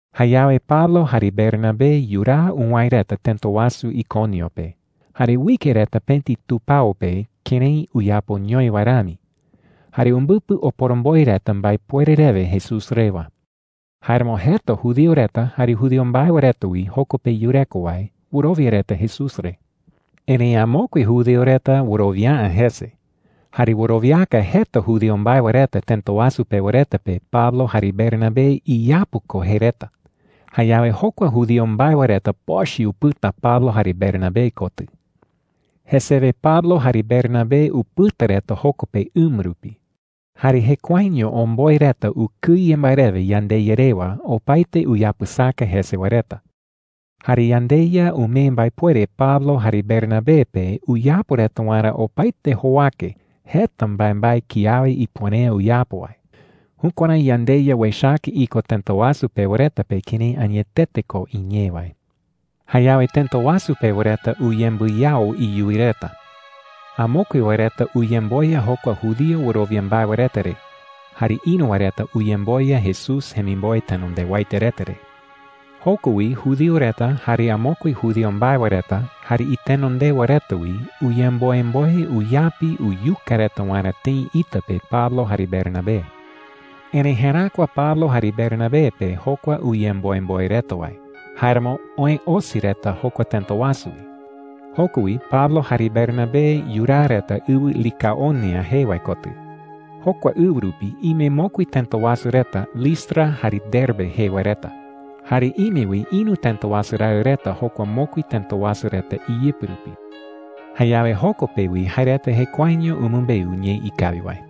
Jayawe Pablo jare Bernabé yuraa uwäe reta tëta wasu Iconio pe. Jare uike reta pëti tupao pe kërái uyapoñoi wae rami. Jare umbɨpɨ oporomboe reta mbaepuere rewe Jesús rewa. Jáeramo jeta judío reta jare judío mbae wae reta wi joko pe yureko wae wɨrowia reta Jesús re. Erëi amokue judío reta wɨrowia’ä jese, jare wɨrowiaka jeta judío mbae wae reta tëta wasu pewa reta pe Pablo jare Bernabé iyapu ko jei reta. Jayawe jokua judío mbae wae reta pochɨ upɨta Pablo jare Bernabé kotɨ. Jesewe Pablo jare Bernabé upɨta reta joko pe ɨma rupi. Jare jekuaeño omboe reta ukɨye mbae rewe yandeYa rewa opaete uyapɨsaka jese wae reta. Jare yandeYa umee mbaepuere Pablo jare Bernabé pe uyapo reta waerä opaete jowake jeta mbaembae kiawe ipuere’ä uyapo wae. Jukuärái yandeYa uechaka iko tëta wasu pewa reta pe kërái añetete ko iñee wae. Jayawe tëta wasu pewa reta uyembɨyao iyuwi reta. Amokue wae reta uyemboya jokua judío wɨrowia mbae wae reta re. Jare ïru wae reta uyemboya Jesús jemimboe tenondewaete reta re. Joko wi judío reta, jare amokue judío mbae wae reta, jare itenondewa reta wi uyemboemboe uyapi uyuka reta waerä tëi ita pe Pablo jare Bernabé. Erëi jeräkua Pablo jare Bernabé pe jokua uyemboemboe reta wae. Jáeramo oë osi reta jokua tëta wasu wi. Joko wi Pablo jare Bernabé yuraa reta ɨwɨ Licaonia jee wae kotɨ. Jokua ɨwɨ rupi ime mokui tëta wasu reta Listra jare Derbe jee wae reta. Jare ime wi ïru tëta wasu raɨ reta jokua mokui tëta wasu reta iyɨpɨ rupi. Jayawe joko pe wi jae reta jekuaeño umɨmbeu ñee ikawi wae.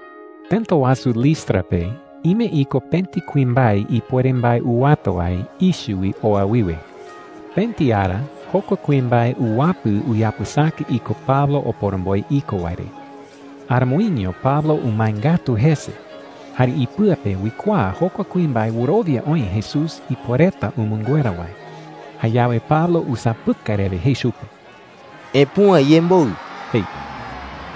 Tëta wasu Listra pe ime iko pëti kuimbae ipuere mbae uwata wae ichɨ wi oa wiwe. Pëti ara jokua kuimbae uwapɨ uyapɨsaka iko Pablo oporomboe iko wae re. Aramoiño Pablo umae ngatu jese, jare ipɨa pe uikuaa jokua kuimbae wɨrowia oï Jesús ipuereta umɨnguera wae. Jayawe Pablo usapɨkai rewe jei chupe: “¡Epüa iyemboɨ!” jei.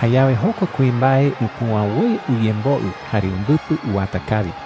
Jayawe jokua kuimbae upüa woi uyemboɨ jare umbɨpɨ uwata kawi.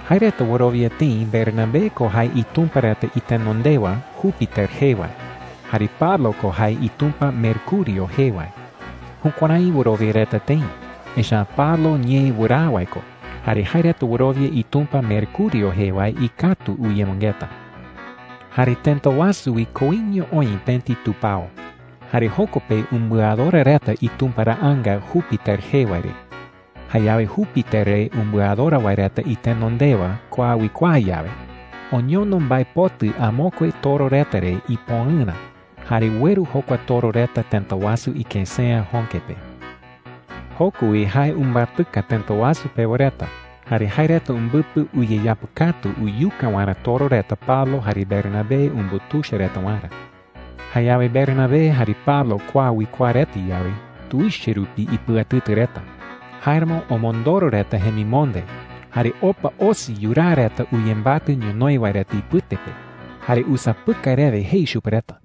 Jae reta wɨrowia tëi Bernabé ko jae itumpa reta itenondewa Júpiter jee wae, jare Pablo ko jae itumpa Mercurio jee wae. Jukuärái wɨrowia reta tëi, echa’ä Pablo ñee wɨraa wae ko jare jae reta wɨrowia itumpa Mercurio jee wae ikatu uyemɨngeta. Jare tëta wasu wi koiño oï pëti tupao, jare joko pe umbɨadora reta itumparaanga Júpiter jee wae re. Jayawe Júpiter re umbɨadora wae reta itenondewa kua uikuaa yawe, oñono mbaepotɨ amokue toro reta re ipoɨrä jare ueru jokua toro reta tëta wasu ikësea jöke pe. Joko wi jae umbatɨka tëta wasu pewa reta, jare jae reta umbɨpɨ uyeyapɨkatu uyuka waerä toro reta Pablo jare Bernabé umbutuicha reta waerä. Jayawe Bernabé jare Pablo kua uikuaa reta yawe, tuicha rupi ipɨatɨtɨ reta. Jáeramo omondoro reta jemimonde, jare opa osi yuraa reta uyembatɨ ñonoï wae reta ipɨte pe. Jare usapɨkai rewe jei chupe reta: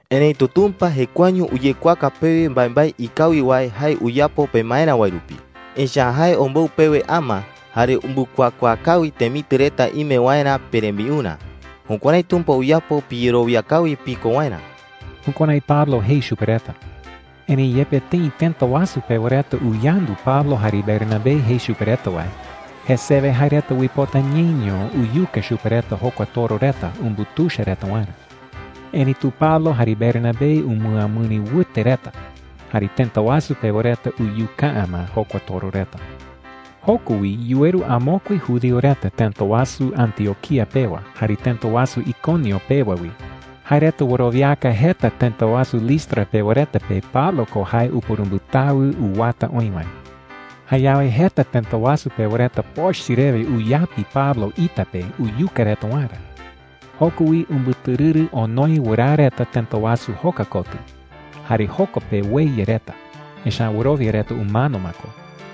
Erëitu Tumpa jekuaeño uyekuaaka pewe mbaembae ikawi wae jae uyapo pemaerä wae rupi. Echa’ä jae ombou pewe ama, jare umbɨkuakuaa kawi temitɨ reta ime waerä perembiurä. Jukuärái Tumpa uyapo piyerowia kawi piko waerä.” Jukuärái Pablo jei chupe reta. Erëi yepe tëi tëta wasu pewa reta uyandu Pablo jare Bernabé jei chupe reta wae, jesewe jae reta uipota ñeño uyuka chupe reta jokua toro reta umbutuicha reta waerä. Erëitu Pablo jare Bernabé umɨamɨri wɨte reta, jare tëta wasu pewa reta uyuka’ä ma jokua toro reta. Joko wi yuweru amokue judío reta tëta wasu Antioquía pewa jare tëta wasu Iconio pewa wi. Jae reta wɨrowiaka jeta tëta wasu Listra pewa reta pe Pablo ko jae upurumbɨtawɨ uwata oï wae. Jayawe jeta tëta wasu pewa reta pochɨ rewe uyapi Pablo ita pe uyuka reta waerä. Joko wi umbɨtɨrɨrɨ onoe wɨraa reta tëta wasu joka kotɨ. Jare joko pe ueya reta, echa’ä wɨrowia reta umano ma ko.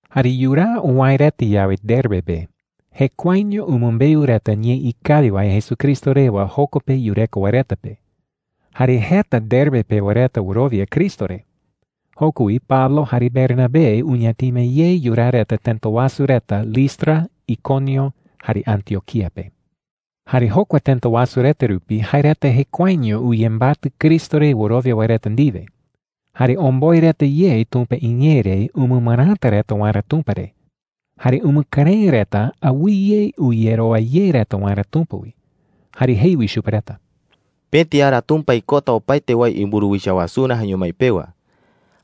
Jare yuraa uwäe reta yawe Derbe pe, jekuaeño umɨmbeu reta ñee ikawi wae Jesucristo rewa joko pe yureko wae reta pe. Jare jeta Derbe pewa reta wɨrowia Cristo re. Joko wi Pablo jare Bernabé uñatima ye yuraa reta tëta wasu reta Listra, Iconio, jare Antioquía pe. Jare jokua tëta wasu reta rupi, jae reta jekuaeño uyembatɨ Cristo re wɨrowia wae reta ndiwe. Jare omboe reta ye Tumpa iñee re umɨmɨräta reta waerä Tumpa re. Jare umɨkɨrëɨ reta awɨye uyerowa ye reta waerä Tumpa wi. Jare jei wi chupe reta: “Pëti ara Tumpa ikota opaete wae imburuwicha wasurä jaeño mái pewa.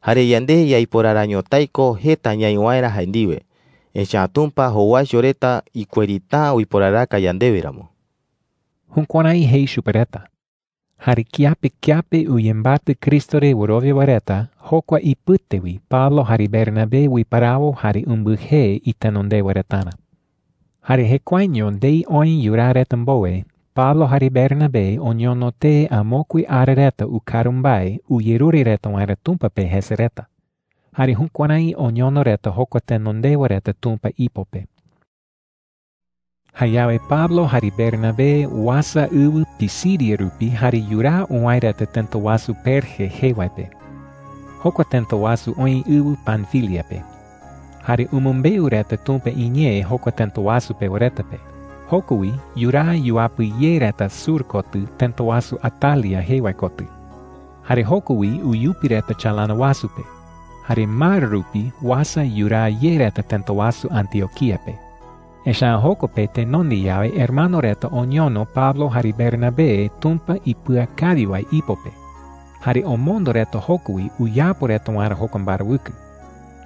Jare yande yaiporara ñotái ko jeta ñaï waerä jae ndiwe, echa’ä Tumpa jowaicho reta ikuerita’ä uiporaraka yandewe ramo.” Jukuärái jei chupe reta. Jare kiape kiape uyembatɨ Cristo re wɨrowia wae reta, jokua ipɨte wi Pablo jare Bernabé uiparawo jare umbɨjee itenondewa retarä. Jare jekuaeño ndei oë yuraa reta mbowe, Pablo jare Bernabé oñono tee amokue ara reta ukaru mbae uyerure reta waerä Tumpa pe jese reta. Jare jukuärái oñono reta jokua tenondewa reta Tumpa ipo pe. Jayawe Pablo jare Bernabé uasa ɨwɨ Pisidia rupi jare yuraa uwäe reta tëta wasu Perge jee wae pe. Jokua tëta wasu oï ɨwɨ Panfilia pe. Jare umɨmbeu reta Tumpa iñee jokua tëta wasu pewa reta pe. Joko wi yuraa yuapɨ ye reta sur kotɨ tëta wasu Atalia jee wae kotɨ. Jare joko wi uyupi reta chalana wasu pe, jare mar rupi uasa yuraa ye reta tëta wasu Antioquía pe. Echa’ä joko pe tenonde yawe hermano reta oñono Pablo jare Bernabé Tumpa ipɨakawi wae ipo pe, jare omondo reta joko wi uyapo reta waerä jokua mbarawɨkɨ.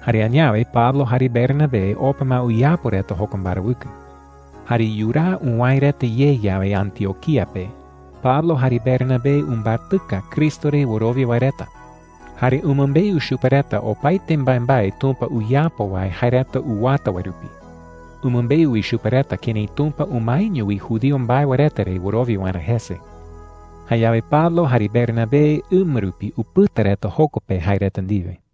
Jare añawe Pablo jare Bernabé opa ma uyapo reta jokua mbarawɨkɨ. Jare yuraa uwäe reta ye yawe Antioquía pe, Pablo jare Bernabé umbatɨka Cristo re wɨrowia wae reta. Jare umɨmbeu chupe reta opaete mbaembae Tumpa uyapo wae jae reta uwata wae rupi. Umɨmbeu wi chupe reta kërái Tumpa umaeño wi judío mbae wae reta re wɨrowia waerä jese. Jayawe Pablo jare Bernabé ɨma rupi upɨta reta joko pe jae reta ndiwe.